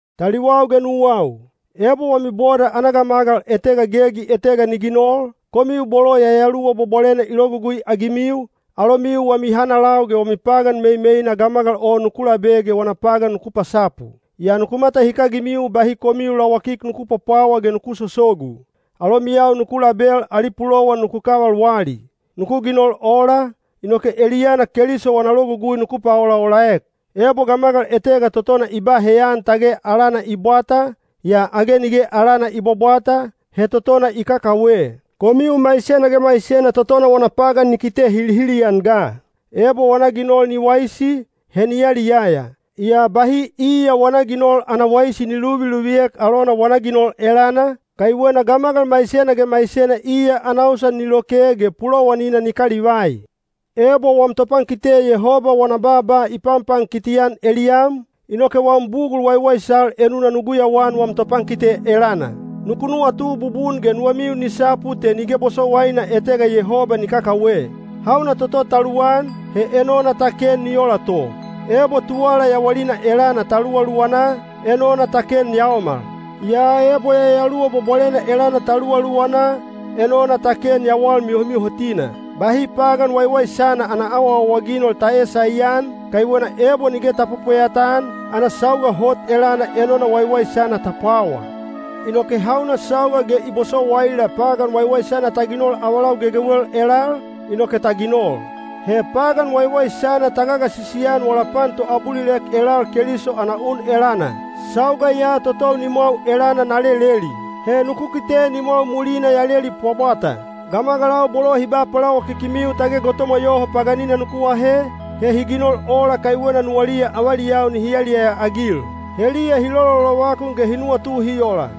Taliwau ge nuwau, ebo wami boda ana gamagal etega gegi etega ni ginol, komiu bolo Yayaluwa Bwabwalena i logugui-agimiu, alomiu wami hanalau ge wami pagan meimeina gamagal o nuku labe ge wana pagan nuku pasapu. Yaa nuku matahikagimiu bahi komiu lawakik nuku pwapwawa ge nuku sosogu. Alomiyau nuku label ali pulowan nuku kaval wali. Nuku ginol ola, inoke eliyana Keliso wana logugui nuku paolaolaek. Ebo gamagal etega totona i ba heyan tage alana i bwata, yaa age nige alana i bwabwata, he totona i kakawe. Komiu maisena ge maisena totona wana pagan ni kite hilihili-an ga. Ebo wana ginol ni waisi, he ni yaliyaya. Yaa bahi iya wana ginol ana waisi ni luviluviek alona wana ginol elana, kaiwena gamagal maisena ge maisena iya ana usan ni loke ge pulowanina ni kalivai. Ebo wam topankite Yehoba wana baaba i panpankiti-an eliyam, inoke wam bugul waiwaisal enuna nu guyauan wam topankite elana. Nuku nuwatu bubun ge nuwamiu ni sapu te nige bosowaina etega Yehoba ni kakawe. Hauna toto ta luwan, he enona ta ken ni ola to. Ebo tuwala yawalina elana ta luwaluwana, enona ta ken yaomal. Yaa ebo Yayaluwa Bwabwalena elana ta luwaluwana, enona ta ken yawal mihomihotina. Bahi pagan waiwaisana ana awaawaginol ta eesaian, kaiwena ebo nige ta pwepweyata-an, ana sauga hot elana enona waiwaisana ta pwawa. Inoke hauna sauga ge i bosowaila pagan waiwaisana ta ginol avalau gegewel elal, inoke ta ginol. He pagan waiwaisana ta gagasisi-an wala pan toabulilek elal Keliso ana un elana. Sauga ya totou nimwau elana na leleli. He nuku kite nimwau mulina ya leli pwabwata. Gamagalau bolo hi ba palawakikimiu tage gotomwa yoho paganina nuku ahe, he hi ginol ola kaiwena nuwaliya avaliyau nihi yaliyaya-agil. Heliya hi lololovakun ge hi nuwatu hi ola,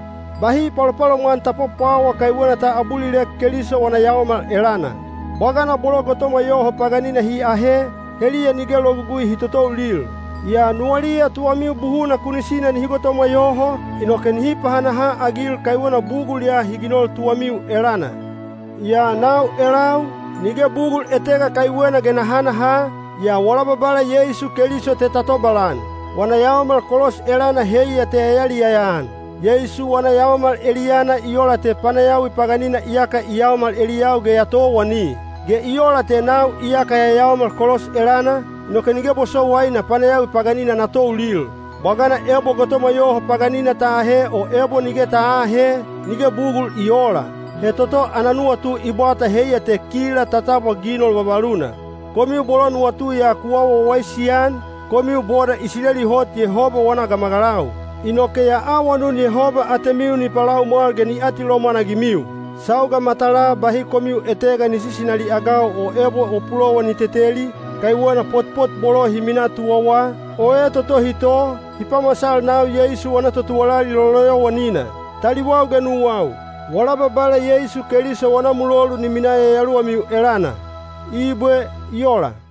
“Bahi palopalomwan ta pwapwawa kaiwena ta abulilek Keliso wana yaomal elana.” Bwagana bolo gotomwa yoho paganina hi ahe, heliya nige logugui hi totoulil. Yaa nuwaliya tuwamiu buhuna kunisina nihi gotomwa yoho, inoke nihi pahanaha-agil kaiwena bugul ya hi ginol tuwamiu elana. Yaa nau elau, nige bugul etega kaiwena ge na hanaha, yaa wala Babala Yeisu Keliso te na tobalan. Wana yaomal kolos elana heiya te ya yaliyaya-an. Yeisu wana yaomal eliyana i ola te panayawi paganina iyaka i yaomal eliyau ge ya towani. Ge i ola te nau iyaka ya yaomal kolos elana, inoke nige bosowaina panayawi paganina na toulil. Bwagana ebo gotomwa yoho paganina ta ahe o ebo nige ta aahe, nige bugul i oola. He toto ana nuwatu i bwata heiya te kila ta tabwa ginol vavaluna. Komiu bolo nuwatu ya ku awa wawaisi-an, komiu boda Isileli hot Yehoba wana gamagalau. Inoke ya awanun Yehoba atemiu ni palaumwal ge ni atilomwan-agimiu. Sauga matalaa bahi komiu etegana ni sisinali-agau o ebo o pulowan ni teteli, kaiwena potpot bolo hi minaa tuwawa, o etotohi to, hi pamasal nau Yeisu wana totuwalali loloyowanina. Taliwau ge nuwau, wala Babala Yeisu Keliso wana mulolu ni minaa yayaluwamiu elana. Ibwe. I ola.